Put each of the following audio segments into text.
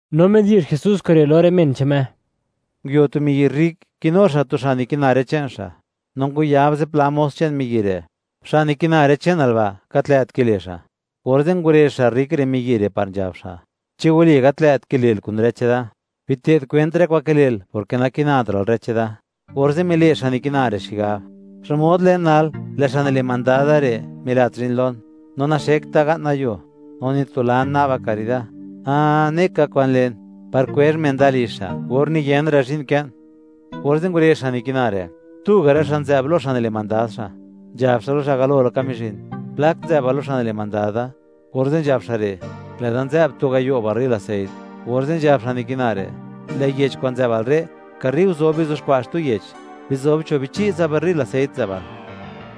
No midi'zh Jesús kure' lo rë men che'n Me: ―Nguio tu miyi' rrik, kinu xa' tu xa' nikina rë che'n xa', no ngwayab zipla mos che'n miyi' re': “Xa' nikina rë che'nal ba', gat lë't kile' xa'.” Orze' ngurezh xa' rrik re' miyi' re' par nzhab xa': “¿Chi wali gat lë't kile'l kun rë cheda? Bite'd kwent rë kwa'n kile'l, porke nakinatra'l rë cheda.” Orze' mile' xa' nikina re' xigab: “¿Xmod len nal, lë' xa' nile' mandad da re' milat zhi'n lon? No naxekt da ga'na yuo, no nitulan na'ba karida. ¡Ah! Ne ka kwan len, par kwezh men da lizh xa', or niyenra' zhi'n kën.” Orze' ngurezh xa' nikina re', tuga' rë xa' nzë'b lo xa' nile' mandad xa'; nzhab xa' lo xa' galo laka mizhin: “¿Plak nzë'bal lo xa' nile' mandad da?” Orze' nzhab xa' re': “Lë'da nzë'b tu gayo' barril aseit.” Orze' nzhab xa' nikina re': “Lë' yech kwa'n nzë'bal re', karre nguzob, bizuxkwa' xtu yech, bizob cho' bichi' tsa barril aseit nzë'bal.”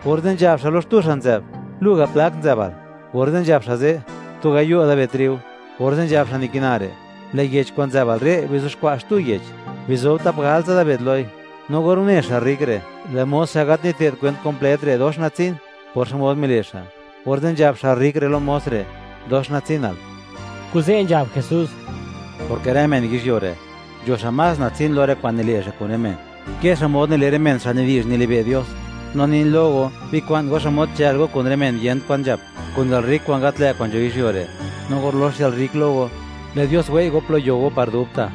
Orze' nzhab xa' lo xtu xa' nzë'b: “Lu ga', ¿plak nzë'bal?” Orze' nzhab xa' ze': “Tu gayo' dabed triu.” Orze' nzhab xa' nikina re': “Lë' yech kwa'n nzë'bal re', bizuxkwa' xtu yech, bizob tap galtsa dabed loi.” No or une xa' rrik re', lë' mos xa' gat nite'd kwent kumplet re', dox natsin por xmod mile' xa', orze' nzhab xa' rrik re' lo mos re': “Dox natsinal.” Kuze' nzhab Jesús: ―Porke rë men yizhyuo re', nzho xa' más natsin lo rë kwa'n nile' xa' kun rë men, ke xmod nile' rë men xa' nidi'zh, nilibe' Dios. ’No nin lo go, bikwa'n go xmod chë'l go kun rë men yent kwan nzhap, kun yalrrik kwa'n gat lë' kwa'n nzho yizhyuo re'. No or lox yalrrik lo go, lë' Dios wei' go plo yo go par dubta'.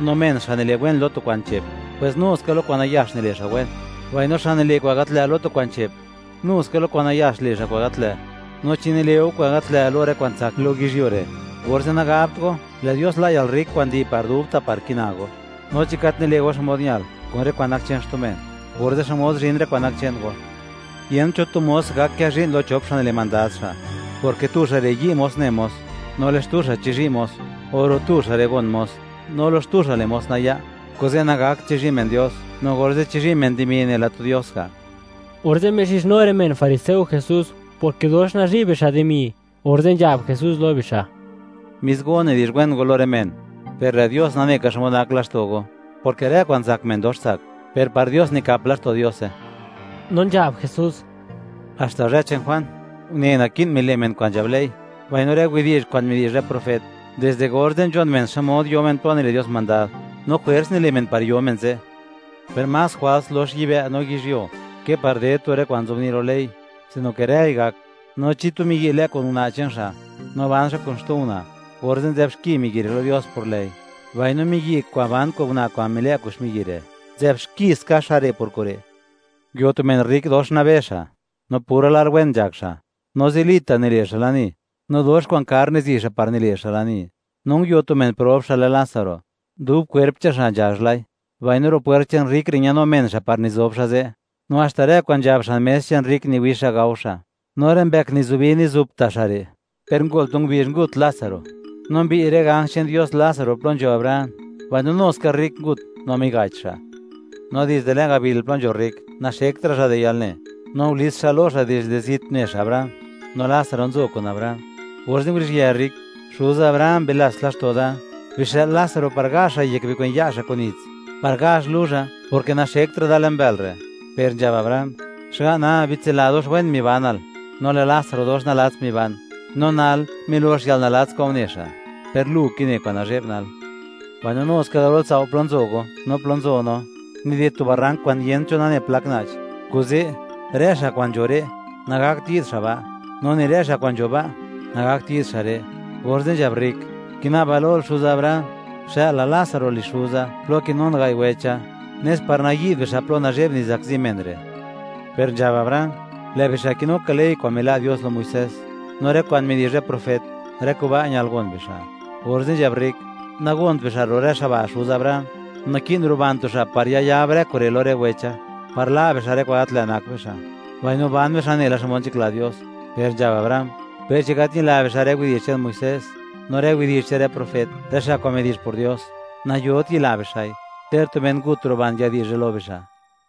’No men xa' nile' wen lo tu kwa'n che'p, pwes nu ska lo kwa'n nayax nile' xa' wen; mbaino xa' nile' kwa'n gat lë' lo tu kwa'n che'p, nu ska lo kwa'n nayax le' xa' kwa'n gat lë'. No, chi nile' go kwa'n gat lë' lo rë kwa'n tsak lo yizhyuo re', orze', nagabt go, lë' Dios la' yalrrik kwa'n nidi' par dubta' par kina go. No chi gat nile' go xmod ñal kun rë kwa'n nak che'n xtu men, orze', ¿xmod zhin rë kwa'n nak che'n go? ’Yent cho tu mos gak kë zhi'n lo chop xa' nile' mandad xa', porke tu xa' re' yi' mos ne mos, no lë' xtu xa' chizhi' mos; o ro' tu rë xa' re' gon mos, no lo xtu xa' le' mos naya'. Kuze' nagakt chizhi' men Dios no orze' chizhi' men dimi nela tu dios ga'. Orze' mixizhnu rë men fariseo Jesús, porke dox nazhi' bixa' dimi, orze' nzhab Jesús lo bixa': ―Mis go nidi'zh wen go lo rë men; per lë' Dios nane ka xmod nak laxto' go; porke rë kwa'n zak men dox tsak, per par Dios nikap laxto' Diose. No nzhab Jesús: ―Haxta zhë che'n Juan, une naki'n mile' men kwa'n nzhab ley mbaino rë widi'zh kwa'n midi'zh rë profet. Dizde orze', nzhon men xmod yo men plo nile' Dios mandad, no jwers nile' men par yo men ze', per más jwals lox yibë' no yizhyuo ke par ded tu rë kwa'n nzobni' lo ley; sino ke rëi gak. ’No chi tu miyi' lë' kun una' che'n xa', no ban xa' kun xtu una', orze' nzë'b xki miyi' re' lo Dios por lë'i; mbaino miyi' kwa'n ban kun una' kwa'n milë' kun xmiyi' re', nzë'b xki ska xa' re', por kure'. ’Nguio tu men rrik, dox nabe xa', no pura lar wen nzhak xa'; no zilita' nile' xa' lani, no dox kwa'n kar nizi' xa' par nile' xa' lani. No nguio tu men prob, xa' lë Lásaro, dub kwerp che'n xa' nzhazh lai; mbaino ro' pwert che'n rrik re' ñanu men xa' par nizob xa' ze'. No haxta rë kwa'n nzhab xan mes che'n rrik niwix xa' gao xa', no rë mbëk nizubi mizup ta' xa' re'. Per ngol tu ngubizh, ngut Lásaro, no mbiy' rë ganj che'n Dios Lásaro plo nzho Abraham; mbaino nu ska rrik ngut no miga'ch xa'. No dizde le'n gabil plo nzho rrik, naxektra' xa' di yalne; no ngulits xa' lo xa' dizde zit une xa' Abraham no Lásaro nzo kun Abraham. Orze' nguruzhië rrik: “¡Xuza Abraham!, bilats laxto' da, bixë'l Lásaro par gazh xa' yek bikwen ya' xa' kun nits, par gazh luzha, porke naxektra' da le'n bël re'.” Per nzhab Abraham: “Xga'na, bitsila dox wen mibanal, no lë' Lásaro dox nalats miban; no nal, milox yalnalats kwa'n une xa', per lu kine kwa'n nazhe'b nal. Mbaino nu ska garol tsao' plo nzo go, no plo nzo no, nided tu barrank kwa'n yent cho nane plak na'ch. Kuze', rë xa' kwa'n nzho re', nagakt yi'd xa' ba', no ni rë xa' kwa'n nzho ba', nagakt yi'd xa' re'.” Orze' nzhab rrik: “Kina'ba lol xuza Abraham, xë'lal Lásaro lizh xuza, plo kinun gai' wecha, nes par nayi'd bixa' plo nazhe'b nizakzi men re'.” Per nzhab Abraham: “Lë' bixa' kinu ka ley kwa'n mila' Dios lo Muisés, no rë kwa'n midi'zh rë profet; rë kuba' ñal gon bixa'.” Orze' nzhab rrik: “Nagont bixa' ro' rë xa' ba', xuza Abraham; naki'n ruban tu xa', par yayab rë kure' lo rë wecha, par la' bixa' rë kwa'n gat lë' nak bixa', mbaino ban bixa' nela xmod nzhakla Dios.” Per nzhab Abraham: “Per chi gat ñila bixa' rë widi'zh che'n Muisés, no rë widi'zh che'n rë profet, rë xa' kwa'n midi'zh por Dios, nayot yila bixa'i, ter tu men ngut ruban, yadi'zhe lo bixa'.”